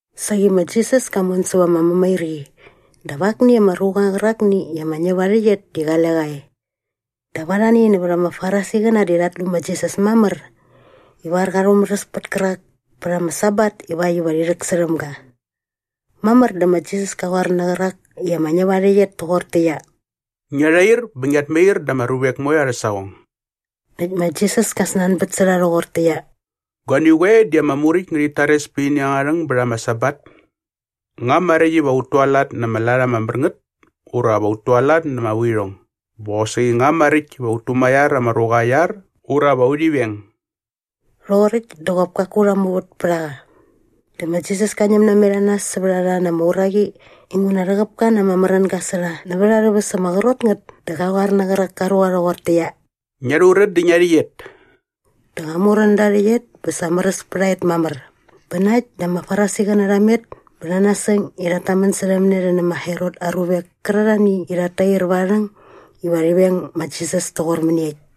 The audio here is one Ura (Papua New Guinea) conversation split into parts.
Saqi ma Jisas ka mon säva ama mämairqi dap akni ama ruqa qärakni i ama ñäp aa rhäqyet di qale qa e. Dap arhani nävät ama Farisiqäna di rhat lu ma Jisas mamär ivar qa rhumäräs pät kärak pät ama Sabat ivakt iva rhi rhäksärhäm ga. Mamär dä ma Jisas ka qoar nä qärak i ama ñäp aa rhäqyet toqortäqyia, “Ngia rhair bä ngiat mair da ama ruvek moe arhä saqong.” Näkt ma Jisas kä snanbät sä rha rhoqortäqyia, “Guani qoe di ama Muräkt ngärhit tares pät ini angärha rhäng bät ama Sabat? Nga maräkt iva ut tualat na ama lat ama mär ngät ura va ut tualat na ama vuirhong bä qosaqi nga maräkt iva ut tumaiar ama ruqa aa iar ura va urhi veng?” Rhoqoräkt dä qop kaku rha muvät pät a qa. Dä ma Jisas ka ñäm namet a nas sävät a rha na ama uraqi inguna rhäqäp ka na ama märänga sä rha nävät arhä väs ama qrot ngät dä qa qoar nä qärak ka ruqa rhoqortäqyia, “Ngia rhurän dä ngia rhäqyet.” Dä qa murän da aa rhäqyet bä sa märäs pät a et mamär. Bä na äkt dä ama Farisiqäna rha met bä rha nasäng i rhat tamän särhäm ne rhi nä ma Herot aa ruvek kärarhani i rhat tair va aa rhäng iva rhi veng ma Jisas toqor mäniekt.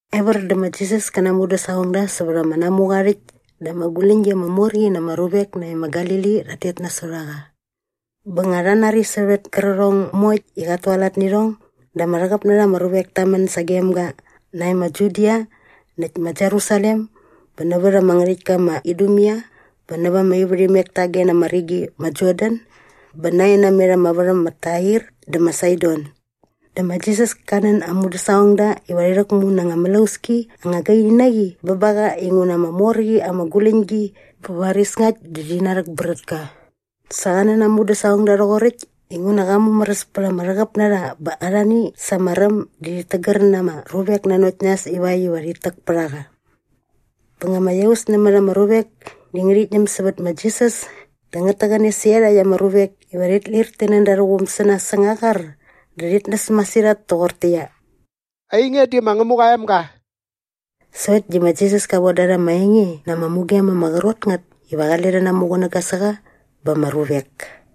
Evär dä ma Jisas kä na aa mudäsaqongda sävät ama namuqa aa rhäkt dä ama guläñgi ama mor qi na ama ruvek nae ma Galili rhat tet nasot a rha. Bä nga rha nari sävät kärqärhong moekt i qat tualat nä irhong dä ama rhäqäp na rha ama ruvek ta män sagem ga nae ma Judia näkt ma Jerusalem bä nävät ama ngärhäktka ma Idumea bä näva ama ivärhimek tage na ama rigi ma Jordan bä nae namet ama värham ma Tair dä ma Saidon. Dä ma Jisas ka nän aa mudäsaqongda iva rhi rhäkmu na anga mlauski anga gaini na qi bä ba qa inguna ama mor qi ama guläñgi bä varis ngakt dä rhi narhäkbrät ka. Sa qa nän aa mudäsaqongda rhoqoräkt inguna qa mumäräs pät ama rhäqäp na rha bä arhani sa ama räm di rhit tägär na ama ruvek nanokt nas ivakt iva rhit täk pät a qa. Bä nga ama iaus nämät ama ruvek di ngärhit ñäm sävät ma Jisas dä ngät täqäne sä iarhakt ama ruvek iva rhit lir ti nän da arhä quum sä nas säng aa qar dä rhit näs masirhat toqortäqyia, “Ainge di ma Ngämuqa aa emga.” Sokt di ma Jisas ka von da rha ama enge na ama mugem ama qrot ngät iva qale rhi namuqunäga sä qa ba ama ruvek.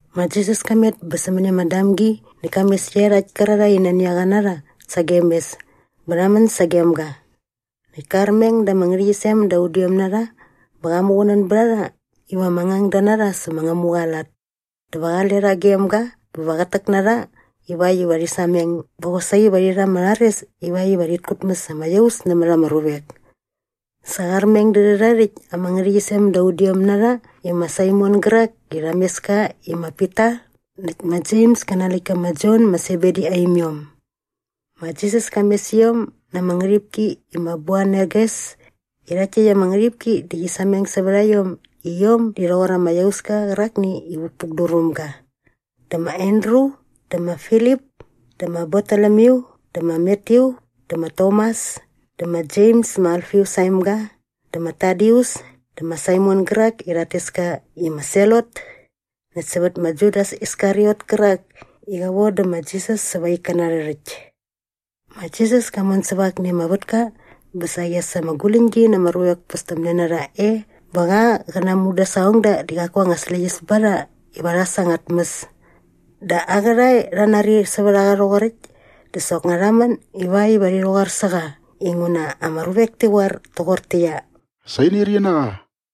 Ma Jisas ka met bä sämäni ama damgi näkt ka mes iarhakt kärarhae i nani a qa na rha sagem mes bä rha män sagem ga. Näkt ka armeng da ama ngärhäqyisem da udiom na rha bä qa muqunän bät a rha iva ama ngangda na rha sä ma Ngämuqa aa lat. Dä va qale rha gem ga bä va qät täk na rha ivakt iva rhi sameng bä qosaqi va rhi rha ama rhares ivakt iva rhit kutmäs ama iaus nämät ama ruvek. Sa qa armeng dä rhärha rhäkt ama ngärhäqyisem da udiom na rha i ma Saimon gärak i qa mes ka i ma Pita näkt ma Jems kä na aa läktka ma Jon ma Sebedi aa imiom. Ma Jisas ka mes iom na ama ngärhipki i ma Boanerges i rhakt täkt ama ngärhipki di qi sameng sävät a iom i iom di rhoqor ama iauska qärakni i vukpukdur väm ga dä ma Andru dä ma Filip dä ma Bartolomyu dä ma Matyu dä ma Tomas dä ma Jems ma Alfius aa emga dä ma Tadius dä ma Saimon gärak i rhat tes ka i ama Selot näkt sävät ma Judas Iskariot kärak i qa vodä ma Jisas säva aa ikkäna arhä rhäkt. Ma Jisas ka mon säva akni ama vätka bä saqi as ama guläñgi na ama ruvek pästämne na rha e bä qa qä na aa mudäsaqongda di qaku anga släqyäs ba rha iva rha äs anga tmäs. Dä aa qärhae rha nari sävät a qa rhoqoräkt dä soknga rha män ivakt iva rhi rhäqoar sä qa inguna ama ruvek ti qoar toqortäqyia, “Sa inirqi na qa.”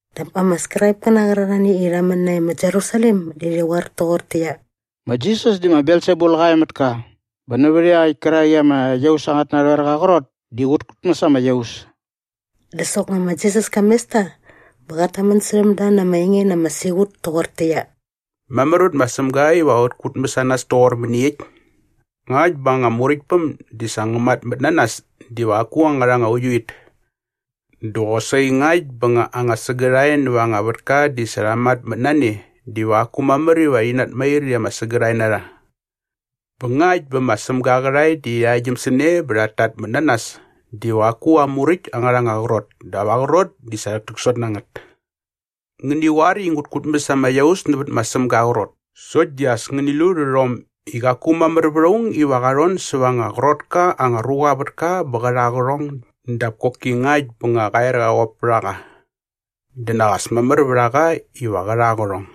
Dap ama Skraipkäna qärarhani i rha män nae ma Jerusalem di rhi qoar toqortäqyia, “Ma Jisas di ma Belsebul qa e mät ka bä nävät iaqäkt kärak i ama iaus angät narhoerqa aa qrot di qät kutmäs ama iaus.” Dä soknga ma Jisas ka mes ta bä qat tamän särhäm da na ama enge na ama siqut toqortäqyia, “Mamär vät ma Sämga iva qä qutmäs a nas toqor mäniekt? Ngakt bä anga muräktpäm di sa ngä matmät na nas diva qaku angärha anga uiuit. Dä qosaqi ngakt bä nga anga sägärhae näva anga vätka di sa rha matmät na ne diva qaku mamär iva rhi natmair i ama sägärhae na rha. Bä ngakt bä ma Sämga aa qärhae rhi arhäktgyäm sä ne bä rhat tatmät na nas diva qaku aa muräkt angärha anga qrot dap aa qrot di sa rhäktäksot na ngät. “Ngäni qoar i ngut kutmäs ama iaus nävät ma Sämga aa qrot sokt di as ngäni lu rhärhom i qaku mamär vät aung iva qa rhon säva anga qrot ka anga ruqa aa vätka bä qä rha aa qärhong dap koki ngakt bä nga qa er qä qop pät a qa. Dä nak as mamär vät a qa iva qä rha aa qärhong.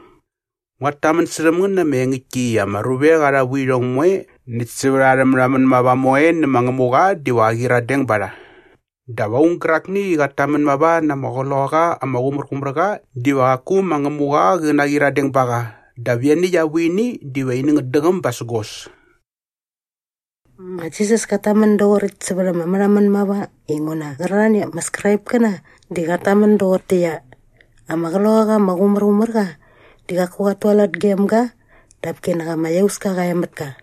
“Nguat tamän särhäm ngän na ama engäktki i ama ruvek arha vuirhong moe näkt sävät arha märhamän mava moe nä ma Ngämuqa diva qä qyiradeng ba rha. Dap aung gärakni i qat tamän mava na ama Qloqaqa ama Qumärqumärqa diva qaku ma Ngämuqa qä naqyiradeng ba qa dap ianiäkt aa vuini diva ini ngät däqäm basägos.” Ma Jisas kat tamän doqoräkt sävät ama märhamän mava inguna qärarhani ama Skraipkäna di rhat tamän doqortäqyia, “Ama Qloqaqa ama Qumärqumärqa di qaku qat tualat gem ga dap kinak ama iauska qa e mät ka.”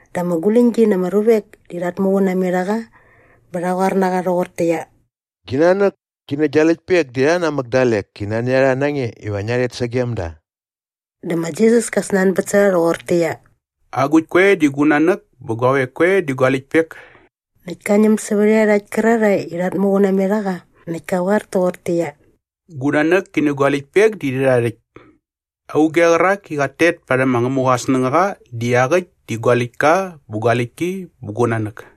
Dap ama guläñgi na ama ruvek di rhat muqun namet a qa bä rha qoar na qa rhoqortäqyia, “Gi nanäk ki nä gia läktpek di iarha namäk dalek i nani a rha na nge iva ngia rhet sagem da.” Dä ma Jisas ka snanbät sä rha rhoqortäqyia, “Agukt koe di gu nanäk bä guavek koe di gua läktpek?” Näkt ka ñäm sävät iarhakt kärarhae i rhat muqun namet a qa näkt ka qoar toqortäqyia, “Gu nanäk ki nä gua läktpek di rhärha rhäkt! Auge qärak i qat tet parhäm ma Ngämuqa aa snängaqa di iaqäkt di gua läktka bä gua läktki bä gu nanäk.”